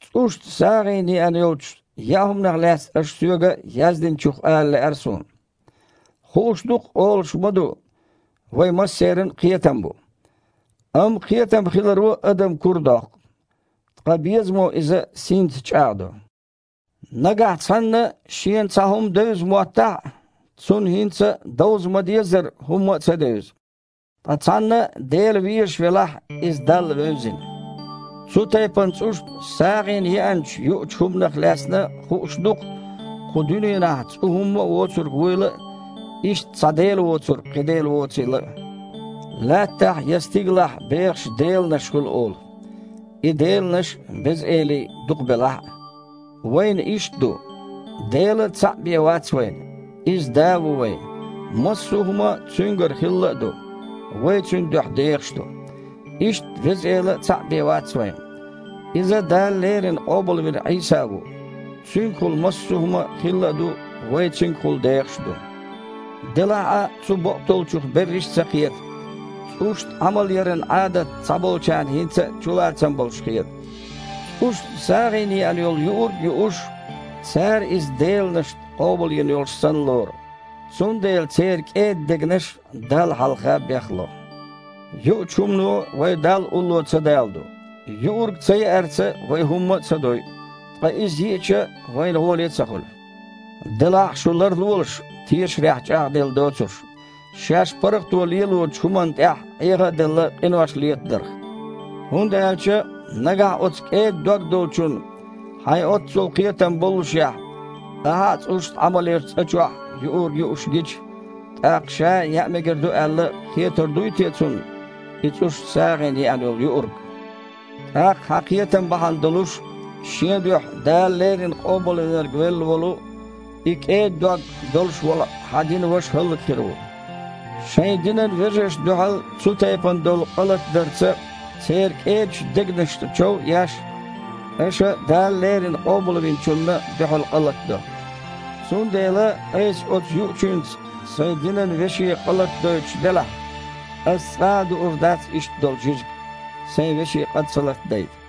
ЦІушна сагІина еана йолчу яа хІуманах лаьцна аша соьга яздинчух ала лаьара суна. Хууш ду-кх, олуш ма-ду: «Вайн массеран а кхетам бу». Амма кхетам хиларо адам курадоккху, ткъа безамо иза синца чІагІдо. Нагахь цхьанна шена цхьа хІума девза моттахь а, цунна хІинца а довза ма-деззара хІумма а ца девза. Ткъа цхьанна Дела везаш велахь, иза Далла вевзина. Цу тайпана цІушна сагІина еанчу юучу хІуманах лаьцна хууш ду-кх, кху дуьненахь цІу хІумма а воцург вуйла а, иштта, цхьа Дела воцург, кхин Дела воцийла а. Лаьттахь я стигалахь бехаш «деланаш» хуьлу олу. И «деланаш» а, «беза элий» а дукха белахь а, вайна иштта ду: Дела цхьаъ бен вац вайн, Иза Да ву вайн, массо а хІума Цуьнгара хилла а ду, вай Цуьнан дуьхьа дехаш а ду. Иштта Веза Эла а цхьаъ бен вац вайн. Иза Дала леррина къобалвина Іийса ву, Цуьнгахула массо хІума хилла а ду, вай Цуьнгахула дехаш а ду. Делахь а цу бакъдолчух берриш а ца кхета. ЦІушна Іамал яран Іадат цхьаболчарна хІинца а чулацам болуш хета. ЦІушна сагІина еана йолу юург а юуш, цара иза деланашна къобалйина йолуш санна лору, цундела церан кІеда дегнаш Далла хьалха бехло. Юучу хІумано вай Далла улло ца даладо. Юург цаяарца вай хІумма а ца дойу, ткъа иза йиъча а, вайна гІолехь а ца хуьлу. Делахь а шу ларлолаш, тешарехь чІагІделла доцурш, шаьш паргІато лелочу хІуманна тІехь, Іеха а делла, къинош летадарх. ХІунда аьлча нагахь оцу кІеда дог долчунна, хьайн оццул «кхетам» боллушехь, ахьа а цІушна Іамал ечу цІа чохь юург юуш гича, тІаккха, ша а яа мегар ду аьлла, хетар дуй те цунна и цІушна сагІина еана йолу юург? ТІаккха хьан «кхетам» бахьана долуш, шен дуьхьа Дала леррина Къобалвинарг велла волу, и кІеда дог долуш волу хьан динан ваша хІаллакьхир ву. Шайн динан вежаршна дуьхьал цу тайпана долу къа латадарца, церан кІедачу дегнашна чов а еш, аша Дала леррина Къобалвинчунна дуьхьал къа латадо. Цундела айса оцу юучуьнца сайн динан веше къа латадойтуш делахь, аса цкъа а дуур дац иштта долу жижиг, сайн веше къа ца латадайта.